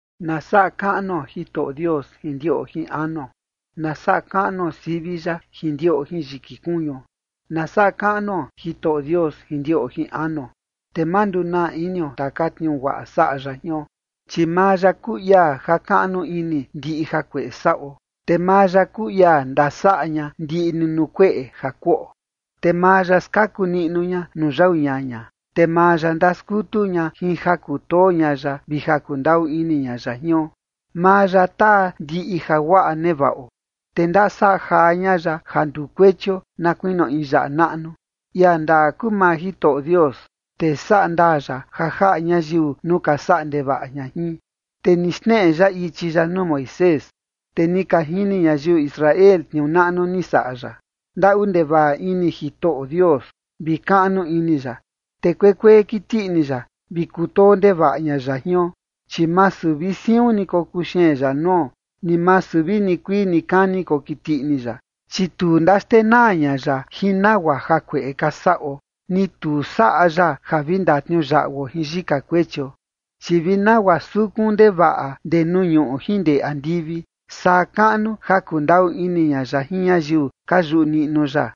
Na saꞌa kaꞌnuo Jitoꞌo Dios jin ndiꞌo jin anuo. Na saꞌa kaꞌnuo sivi ya jin ndiꞌo jin yiki kuñuo. Na saꞌa kaꞌnuo Jitoꞌo Dios jin ndiꞌo jin anuo, te ma ndunaa inio taka tniuu guaꞌa saꞌa ya jion. Chi maa ya kuu ia jakaꞌnu ini ndiꞌi jakueꞌe saꞌo. Te maa ya kuu ia ndasaꞌa ña ndiꞌi ni nuu kueꞌe ja kuꞌo. Te maa ya skaku ña nuu yau ñaña, te maa ya ndaskutu ña jin ja kutoo ña ya vi ja kundaꞌu ini ña ya jion. Maa ya taa ndiꞌi jaguaꞌa nevaꞌo, te ndasajaa ña ya ja nduu kuechio na kuinio in yaꞌa naꞌnu. Ia ndaa kuu maa Jitoꞌo Dios, te sandaa ya ja jaꞌa ñayiu nuu ka saꞌa ndevaꞌa ña jin. Te ni xneꞌe ya ichi ya nuu Moisés, te ni ka jini ñayiu Israel tniuu naꞌnu ni saꞌa ya. Ndaꞌu ndevaꞌa ini Jitoꞌo Dios vi kaꞌnu ini ya. Te kuekuee kiti ini ya, vi kutoo ndevaꞌa ña ya jion. Chi masu vi siun ni kokuxeen ya nuo, ni masu vi nikuii nikani kokiti ini ya. Chi tu ndaxtenaa ña ya jin nagua jakueꞌe ka saꞌo, ni tu saꞌa ya ja vi ndatniuyaꞌuo jin yika kuechio. Chi vi nagua sukun ndevaꞌa ndee nuu ñuꞌu jin ndee andivi, saa kaꞌnu ja kundaꞌu ini ña ya jin ñayiu ka yuꞌu niꞌnu ya.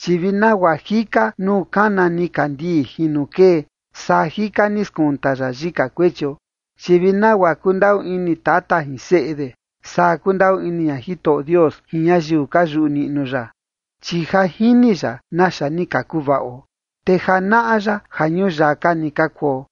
Chi vi nagua jika nuu kana nikandii jin nuu kee, saa jika ni skunta ya yika kuechio. Chi vi nagua kundaꞌu ini tata jin seꞌe de, saa kundaꞌu ini ña Jitoꞌo Dios jin ñayiu ka yuꞌu niꞌnu ya. Chi ja jini ya naxa ni ka kuvaꞌo, te ja naꞌa ya ja ñuyaka ni ka kuo.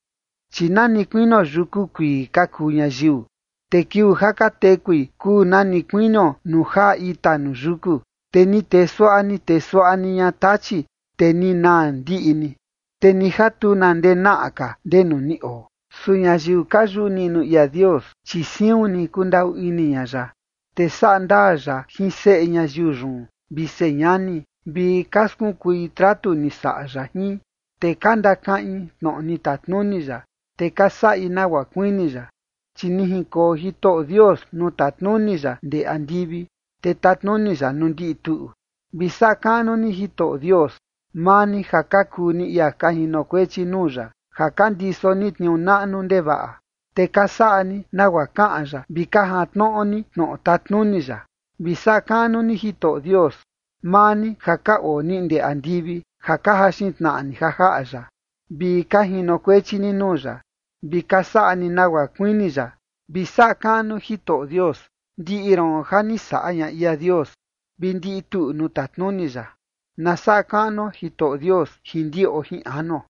Chi nani kuinio yuku kuii ka kuu ñayiu, te kiuu ja ka tekui kuu na ni kuinio nuu jaa ita nuu yuku. Te ni tee suaꞌa ni tee suaꞌa ni ña tachi, te ni naa ndiꞌi ni, te ni ja tu na ndenaꞌa ka ndenu ni oo. Su ñayiu ka yuꞌu niꞌnu ia Dios, chi siun ni kundaꞌu ini ña ya, te saꞌa ndaa ya jin seꞌe ñayiu yun vi señani, vi ka skunkui tratu ni saꞌa ya jin, te ka ndakaꞌin tnoꞌo ni tatnuni ya, te ka saꞌi nagua kuini ya. Chi ni jinkoo Jitoꞌo Dios nuu tatnuni ya ndee andivi, te tatnuni ya nuu ndiꞌi tuꞌu. Vi saꞌa kaꞌnu ni Jitoꞌo Dios, maa ni ja ka kuu ni ia ka jinokuechi nuu ya, ja ka ndiso ni tniuu naꞌnu ndevaꞌa, te ka saꞌa ni nagua kaꞌan ya vi ka jantnoꞌo ni tnoꞌo tatnuni ya. Vi saꞌa kaꞌnu ni Jitoꞌo Dios, maa ni ja ka oo ni ndee andivi ja ka jaxin tnaꞌa ni ja jaꞌa ya, vi ka jinokuechi ni nuu ya, vi ka saꞌa ni nagua kuini ya. Vi saꞌa kaꞌnu Jitoꞌo Dios, ndiꞌi ron ja ni saꞌa ña ia Dios, vi ndiꞌi tuꞌu nuu tatnuni ya. Na saꞌa kaꞌnuo Jitoꞌo Dios jin ndiꞌo jin anuo.